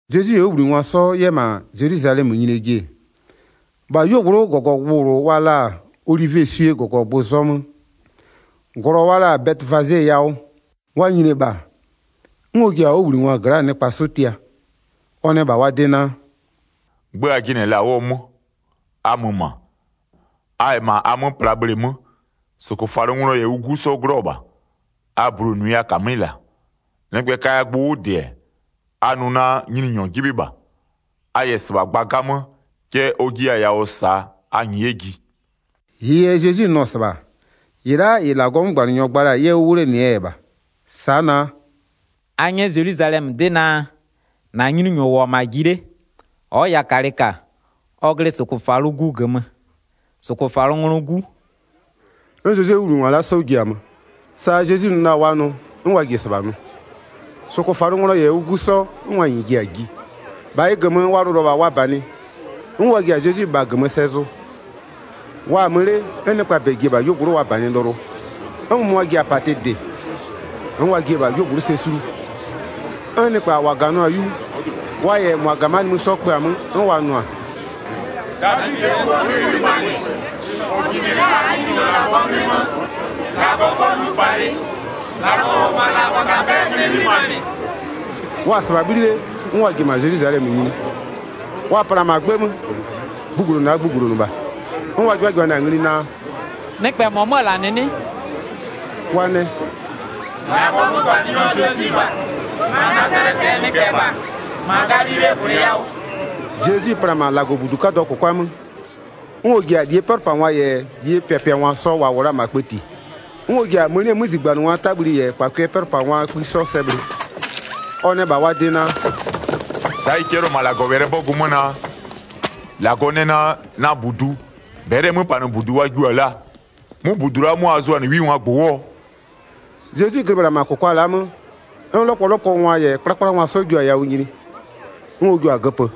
Zezwi -yɛ ɔ 'wʋbhlinɩngwa 'sɔ 'yɛ -ma Zelwizalɛmö nyinie ji-e, -bha 'yuogblʋ'ʋ -gɔgɔgbʋ -bhlʋ wa la-a Olivieswie -gɔgɔgbʋ zɔmöö -glɔ wa la-a Bɛtɩfaze yawʋ, wa nyini-e -bha, 'n ɔ ji-a ɔ 'wʋbhlinɩngwaa gla'aa nɩkpa 'sɔ tia. Ɔ nɛ -bha wa de naa: “'Gbë a jɩnɩ-ɛ -la 'wʋɔ 'mö, a mö -ma, a -yɛ -ma a 'mö pla bhleemö, -sʋkʋfalʋnglɔ -yɛ ʋ 'gu 'sɔ 'glɔ-ɔ -bha. A bulonʋɩ a -kamɩ'ɩ -la. Nɩkpɛ kaya gbʋ 'wʋ -dɩ-ɛ, a nʋ naa: Nyininyɔ 'jɩbhɩ -bha. A -yɛ -sɩbha gba 'gamö, cɛ ɔ jiya-a yawʋ -saa a -nyɩɩ 'yɛ ji.” 4-Ɩɩ yɛ Zezwi nʋ-ɔ -sɩbha, -ɩ la'a -ɩ -Lagɔɔ 'mögbanɩnyɔ gba la-a 'yɛ 'wʋ 'wlenɩɛ yɛ -bha. Sa'a naa: “A 'nyɛ Zelwizalɛmö 'dɩ naa: -Na Nyininyɔ -wʋ-ɔ -ma ji 'le. Ɔ'ɔ yakalɩ -ka, ɔ glɩ -sʋkʋfalʋgu -gömö, -sʋkʋfalʋnglɔɔ 'gu.” 'N Zezwie 'wʋbhlinɩngwa la'a 'sɔ ji-a mö, sa Zezwi nʋ la-a wa nʋ, 'n wa ji-e -sɩbha nʋ. 7-Sʋkʋfalʋnglɔ -yɛ ʋ 'gu 'sɔ, 'n wa -nyɩɩ ji-a ji, -bha ɩ -gömö wa lʋlʋ-ɔ -bha wa -banɩ, 'n wa ji-a Zezwi -bha -gömö sɛ zʋ. Wa-a 'mö 'le, 'n nɩkpaa -bɛ ji-e -bha 'yuogblʋ'ʋ wa -banɩ lʋlʋ, 'n -mʋmʋa ji-a -patɩ -dɩ, 'n wa jiɩ-e -bha 'yuogblʋ'ʋ sɛ sulu. 'N nɩkpa -wa -ganʋa-a 'yu, wa -yɛ -mʋa -ga -ma nimï 'sɔ kpö-a 'mö. 'N wa nʋa: “Davidɩɛ 'Guo 'nglɩ 'ghlimanɩ. -Ɔ jinɩ-ɛ la'a -aa Nyininyɔ -Lagɔɔ 'nglɩ 'mö, -Lagɔ 'pɔ 'nyupalɩ. -Lagɔ -ʋ -wʋ-ɔ -ma -Lagɔtapɛ'ɛɛ 'nglɩ 'ghlimanɩ.” Wa-a -sɩbha 'bhli 'le, 'n wa ji-e -ma Zelwizalɛmö nyini. Wa pla-a -ma 'gbë 'mö, gbugblonʋ a gbugblonʋ -bha. 'N wa 'jɩbhajɩbhanɩ-a ngli naa: “Nɩkpɛ -mɔ 'mö-ö -la -nɩ 'nɩ?” Wa nɛ: “-Lagɔɔ 'mögbanɩnyɔ Zezwi -bha, -ma Nazalɛtɩɛ nɩkpɛ -bha, -ma Galilee gwlɩ yawʋ.” Zezwi pla-a -ma -Lagɔbudu 'kadʋɔ -kʋkwa 'mö, 'n ɔ ji-a -lie 'pɛlʋpangwa -yɛ -lie pɩapɩangwa sɔ -wa -wʋ la-a -ma kpëti, 'n ɔ ji-a mënie 'mözigbanɩngwaa 'tabhli -yɛ -kpakʋɩɛ 'pɛlʋpangwaa kpï 'sɔ sɛ bhlɩ. Ɔ nɛ -bha wa de naa: “Sa'a ɩ 'cɛlɩɔ-ɔ -ma -Lagɔwɛlɩɛ 'bɔgʋ 'mö naa: -Lagɔ nɛ naa: Na -budu, -bɛlɩɛ 'möpanɩbudu wa jiʋ-a laa. 'Mʋ -budu la'a 'mʋ a zʋa-a 'wingwaa -gbʋ 'wʋɔ?” Zezwi glɩ -bhla -ma -kʋkwa la'a 'mö, 'n 'lɔkpɔlɔkpɔngwa -yɛ bhɩgbökangwa 'sɔ jio-a yawʋ nyini, 'n ɔ jua-a göpö.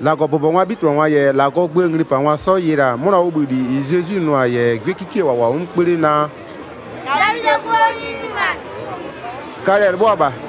15-Lagɔbʋbɔngwaa 'bhitɩbhangwa -yɛ -Lagɔɔ gböö nglipangwa 'sɔ yɩlɩ-a 'mʋnaa 'wʋbhïli -ɩ Zezwi nʋ-a -yɛ 'gwiekikie -wa -wʋ-a 'mö 'kpö 'le naa: “Davidɩɛ 'Guo 'nglɩ 'ghlimanɩ-ɛ,” kalɛ-ɛ 'lɩbhʋa -bha.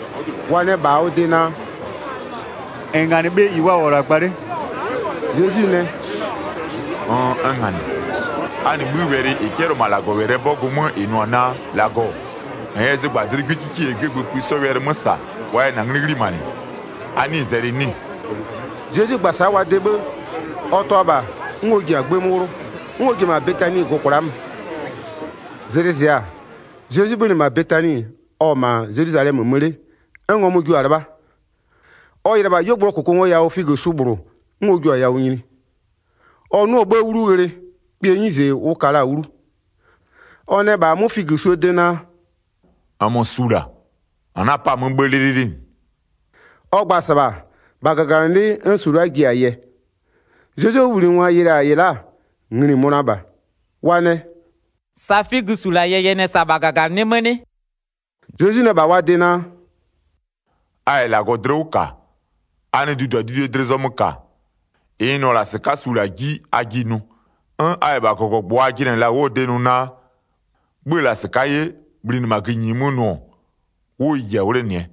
Wa nɛ -bha ɔ de naa: “-N -nganɩ bhe -ɩ wa -wʋ-ɔ -la gba 'le?” Zezwi nɛ: “Nn, n -nganɩɩ. A -nɩ 'bhï wɛlɩ -ɩ 'cɛlɩɔ-ɔ -ma -Lagɔwɛlɩɛ 'bɔgʋ 'mö -ɩ nʋ-ɔ naa: -Lagɔ, -n yɛ zɩgbadlɩ'ɩ 'gwiekikie -yɛ 'gwiegbëëpï 'sɔ wɛlɩ 'mö -sa, wa yɛ -na 'nglɩ 'ghlimanɩ, a 'nɩɩ-ɩ zɛlɩ 'nɩ-ɩ?” Zezwi gba-a sa'a wa de 'bhë, ɔ tʋa-a -bha, 'n ɔ ji-a 'gbë 'mö 'wlʋ, 'n ɔ ji-e -ma Betani gʋ-ʋ kwla'a mö. Zlɩ zɩ-a, Zezwi 'bhönɩ -ma Betani, ɔ-ɔ -ma Zelwizalɛmö nimï mö 'le, 'n ngɔmʋ jio-a 'lɩbha. Ɔ yɩlɩ-ɛ -bha 'yuogblʋɔ -kʋkʋngoyawʋ figösu -bhlʋ, 'n ɔ jiʋ-a yawʋ nyini. Ɔ 'nʋ-ʋ 'bhë 'wlu ghlɩ, kpɩɛ 'nyize ʋ ka la-a 'wlu. Ɔ nɛ -bha 'mʋ figösuo de naa: “-Nmö su -la, -n 'na-a 'pa-a 'mö 'bhë 'lɩlɩlɩ -nɩ.” Ɔ gba-a -sɩbha, -bha -gaganɩlɩ'ɩ 'n su la'a ji-a yɛ. Zezwie 'wʋbhlinɩngwa yɩlɩ-a -ɩ la'a, ngli-i mönʋa -bha. Wa nɛ: “Sa figösu -la yɛyɛnɩ-ɛ -sa -bha -gaganɩlɩ'ɩ 'mö 'nɩ?” Zezwi nɛ -bha wa de naa: “A -yɛ -Lagɔ dlɩ 'wʋ -ka, a nɩ duduadudue dlɩ zɔmö -ka, -ɩ n nʋ-ɔ -la -sɩka'a su -la 'ji, a jiɩ nʋ. 'N a -yɛ 'yɛ -bha -gɔgɔgbʋ a jɩnɩ-ɛ -la 'wʋɔ de nʋ naa: 'Bhö-ö -la -sɩka'a 'ye, bhlinɩ -ma gïnyi 'mö nʋ-ɔ, 'wʋ ɩ ji-a 'wlenɩɛ.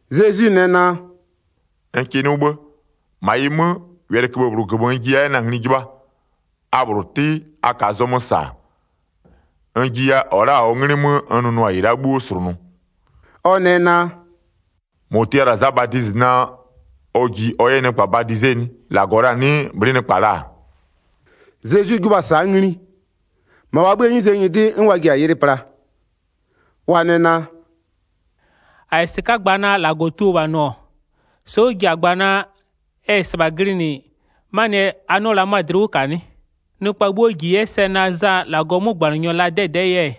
Zezwi nɛ naa: “N kɩ 'nʋ 'bhë, -ma ɩ 'mö, wɛlɩköbhë -bhlʋ -gömö n jiya 'yɛ na-a ngli 'jɩbhaa, a -bhlʋ 'tɩ, a -kaa zɔmö -sa-a, n jiya -ɔ la'a -ɔɔ 'nglɩ 'mö n nʋnʋ-a -ɩ la'a 'bhuo -slʋnʋ.” Ɔ nɛ naa: “-Mɔ tia la-a Za Badizɩ naa ɔ ji ɔ 'yɛ nɩkpa badize 'nɩ? -Lagɔ la-a 'nɩɩ bhlɩ'ɩ nɩkpa la-a?” Zezwi 'jɩbhʋa-a sa'a ngli, -ma wa 'bhïë 'nyize nyɩdɩ 'n wa ji-a yɩlɩ pla. Wa nɛ naa: “-A -yɛ -sɩka'a gba naa -Lagɔ tuo -bha nʋ-ɔ, sa'a ɔ ji-a gba naa: Ɛ -yɛ -sɩbha glɩnɩ, 'manɩɛ yɛ a 'nɩɔ la 'mö-a dlɩ 'wʋ -ka 'nɩ? Nɩkpa 'bhuo -ji 'yɛ sɛ naa Za -Lagɔɔ 'mögbanɩnyɔ la-a 'dɛdɛ'ɛɛ yɛ,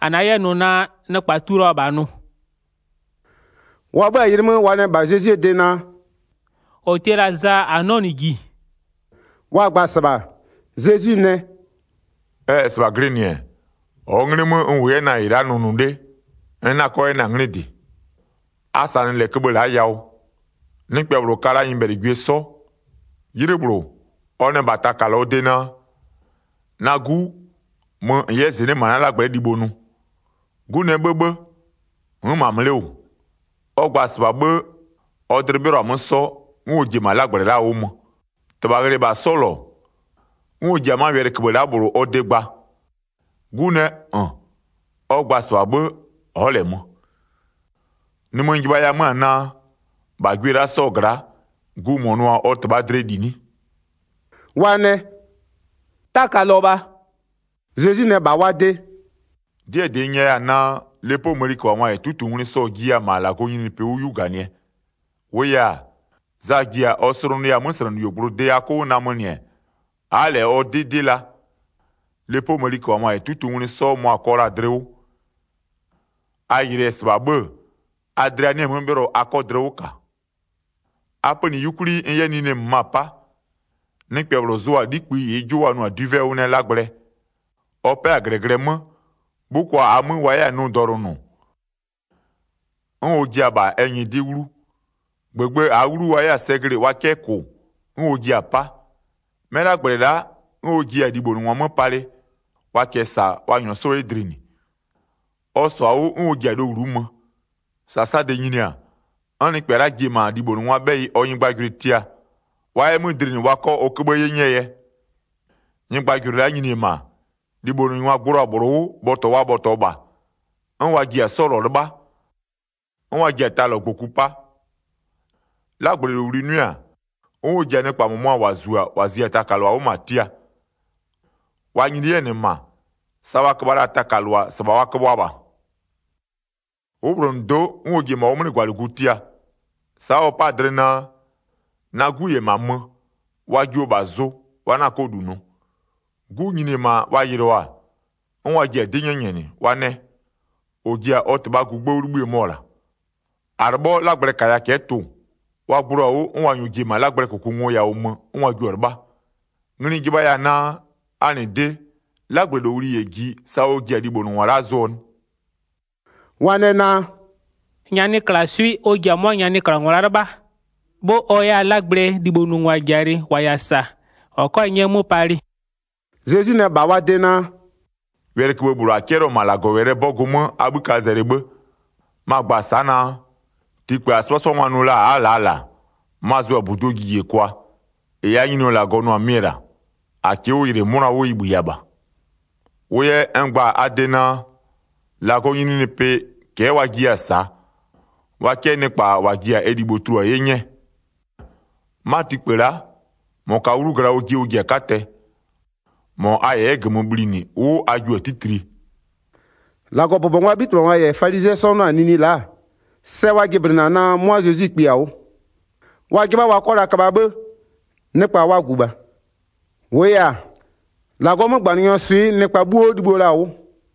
-a 'na 'yɛ nʋ naa nɩkpɛ tuo la -bha nʋ.” Wa 'bhö-a yɩlɩ 'mö wa nɛ -bha Zezwie de naa: “-Ɔ tia la-a Za -a 'nɩɔ -nɩ -ji.” Wa gba-a -sɩbha, Zezwi nɛ: “Ɛ -yɛ -sɩbha glɩnɩ-ɛ, -ɔɔ 'nglɩ 'mö n -wʋ 'yɛ-ɛ na-a -ɩ la'a nʋnʋ 'le n 'na-a 'kɔ 'yɛ na-a 'nglɩ -dɩ. A -sanɩ -lɛ köbhë la'a yawʋ. Nɩkpɛ -bhlʋ ka la nyɩbhɛlɩgwie 'sɔ. 'Ylɩ -bhlʋ, ɔ nɛ -bha taka -lɔɔ de naa: Na 'gu, mö -n 'yɛ -zɩnɩ'ɩ -ma na 'lagblɛ'ɛ libho nʋ. 'Gu nɛ 'bhëbhë, n'n -ma mö 'le -wʋ. Ɔ gba-a -sɩbha 'bhë, ɔ dlɩ 'bhɩlɔ-a 'mö 'sɔ, 'n ɔ ji-e -ma 'lagblɛ la'aa 'wʋ mö. 30-Tɩbha ghlɩ-ɛ -bha 'sɔ -lɔ, 'n ɔ ji-a 'ma köbhë la'a -bhlʋ ɔ de gba. 'Gu nɛ: -N! Ɔ gba-a -sɩbha 'bhë, ɔ'ɔ -lɛ mö. Nimï n jɩbhaya 'mö-a naa: -Bha gwie la'a 'sɔɔ gla'a, gu -mɔ nʋ-a ɔ -tɩbhaa dlɩɛ -li 'nɩ?” Wa nɛ: “Taka -lɔ -bha.” Zezwi nɛ -bha wa de: “'Dɩɛ -dɩ n nyɛya-a naa: Lepoo mëniköbhangwa -yɛ -tuutungwlɩ sɔ-ɔ jiya-a -ma -Lagɔɔ nyininyinipɩ 'wʋ 'yu -ganɩɛ. 32-Wʋʋ yɛ-a, Za ji-a ɔ slʋnʋya-a 'möslɛnɩyuogblʋ de a 'kʋ 'wʋ namönɩ-ɛ, a'a -lɛ ɔ 'dɩ 'dɩ la. Lepoo mëniköbhangwa -yɛ -tuutungwlɩ 'sɔ, mʋa-a kɔ la-a dlɩ 'wʋ. A yɩlɩɩ-ɛ -sɩbha 'bhë-ë, a dlɩa 'nɩ-ɛ 'mö 'bhɩlɔ a 'kɔ dlɩ 'wʋ -ka. A pönɩ 'yukwli n 'yɛ nine -möma 'pa. Nɩkpɛ -bhlʋ zʋ-a 'likpï -ɩɩ 'jʋ wa nʋ-a dwivɛ 'wʋ nɛɛ 'lagblɛ. Ɔ 'pɛ-a -glɛglɛ 'mö, 'bhʋkwa -aa 'mö wa 'yɛ-a nʋ dɔlʋnʋ, 'n ɔ jia-a -bha ɛ nyɩdɩ'ɩ 'wlu. -Gbëgbë -aa 'wlu wa 'yɛ-a sɛ glɩ-ɩ wa 'kɛ -kʋ 'n ɔ jia-a 'pa. 'Mɛ 'lagblɛ la'a, 'n ɔ jiɛ-a libhonʋngwa 'mö palɩ, wa -kɛɛ -sa, wa -nyɔɔ 'sɔ 'yɛ dlinɩ. Ɔ -sɔ-a 'wʋ 'n ɔ ji-a lowlu'u mö. 34-Sasade nyini-a, 'n nɩkpɛ la'a ji-e -ma libhonʋngwaa 'bhɛyɩ ɔ nyɩgbajʋlʋɩ tia, wa 'yɛ 'mö -dlinɩ wa 'kɔ ɔ köbhë 'ye 'nyɛɛ yɛ. Nyɩgbajʋlʋɩ la'a nyini-e -ma, libhonʋngwa gblo-a -bhlʋ 'wʋ bhɔtɔ wa bhɔtɔɔ -bha, 'n wa ji-a 'sɔ -lɔ 'lɩbha, 'n wa ji-a ta -lɔ -gboku 'pa. 'Lagblɛlowli 'nʋɩ-a, 'n ɔ ji-a nɩkpa -mʋmʋa -wa -zu-a -wa zia taka -lʋa -ma tia. Wa nyini 'yɛ-ɛ -nɩ -ma, sa wa köbha la-a taka -lʋa -sɩbha wa köbhʋa -bha. 'Wʋbhlonʋdo'o, 'n ɔ ji-e -ma ɔ 'mlɩgwalɩgu tia. Sa'a ɔ 'pa-a dlɩ naa: Na 'gu -yɛ -ma mö, wa jio -bha zʋ, wa 'na 'kɔ -lu nʋ. 'Gu nyini-e -ma wa yɩlɩɔ-a, 'n wa ji-a 'dɩ 'nyɛnyɛnɩ. Wa nɛ: -Ɔ ji-a ɔ -tɩbhaa gugbë 'wʋ 'libhïë mɔ-ɔ -la. -A 'lɩbhɔ 'lagblɛ -kaya cɛ'ɛ tʋ-ʋ. Wa gblo-a 'wʋ, 'n wa -nyɔɔ ji-e -ma 'lagblɛɛ -kʋkʋngoyawʋ mö 'n wa jio-a 'lɩbha. Ngli n jɩbhaya-a naa: A -nɩ de, 'lagblɛlowli -yɛ ji, sa ɔ ji-a libhonʋngwa la'a zʋɔ 'nɩ?” Wa nɛ naa: “Nyanɩklaswɩ'ɩ ɔ ji-a 'mʋa nyanɩklangwa la'a 'lɩbhaa. 'Bhë ɔ 'yɛ-a 'lagblɛ libhonʋngwa -jalɩ -wa -yɛ-a -sa -wa 'kɔ-a 'nyɛ 'mö palɩ.” Zezwi nɛ -bha wa de naa: “Wɛlɩköbhë -bhlʋ 'cɛlɩɔ-ɔ -ma -Lagɔwɛlɩɛ 'bɔgʋ 'mö a 'bhï ka zɛlɩ 'bhë. Ma-a gba-a sa'a naa: Tikpë -a 'sɩbhasɩbhangwa nʋ la-a a'a-a -laa -la-a, ma-a zʋ-a -buduo jijekwa. -Ɩ -aa Nyininyɔ -Lagɔ nʋ-a mɩ-ɛ -la, -a -kɩɩ 'wʋ yɩlɩ 'mʋna 'wʋ ɩ -bhïya -bha. Wʋ yɛ n gba-a a de naa: -Lagɔɔ nyininyinipɩ, cɛ'ɛ wa jiya-a -saa, wa 'kɛ nɩkpa -wa ji-a ɛ libho tulua 'ye 'nyɛ. [ 'Ma tikpë la'a, -mɔ -kaa 'wlu gla ɔjɩ ɔ ji-a 'katɛ. -Mɔ a -yɛ 'yɛ -gömö bhlinɩ 'wʋ a jio-a 'titlie.”] 45-Lagɔbʋbɔngwaa 'bhitɩbhangwa -yɛ falizɩɛ 'sɔ 'nʋ-a nini la'a-a, sɛ wa jɩblɩnɩ-a naa 'mʋa Zezwi kpi-a 'wʋ. Wa 'jɩbha wa 'kɔ la köbha 'bhë, nɩkpa wa -gu -bha. -Wʋʋ yɛ-a, -Lagɔɔ 'mögbanɩnyɔɔ swɩ'ɩ nɩkpa 'bhuo libhïo la-a 'wʋ.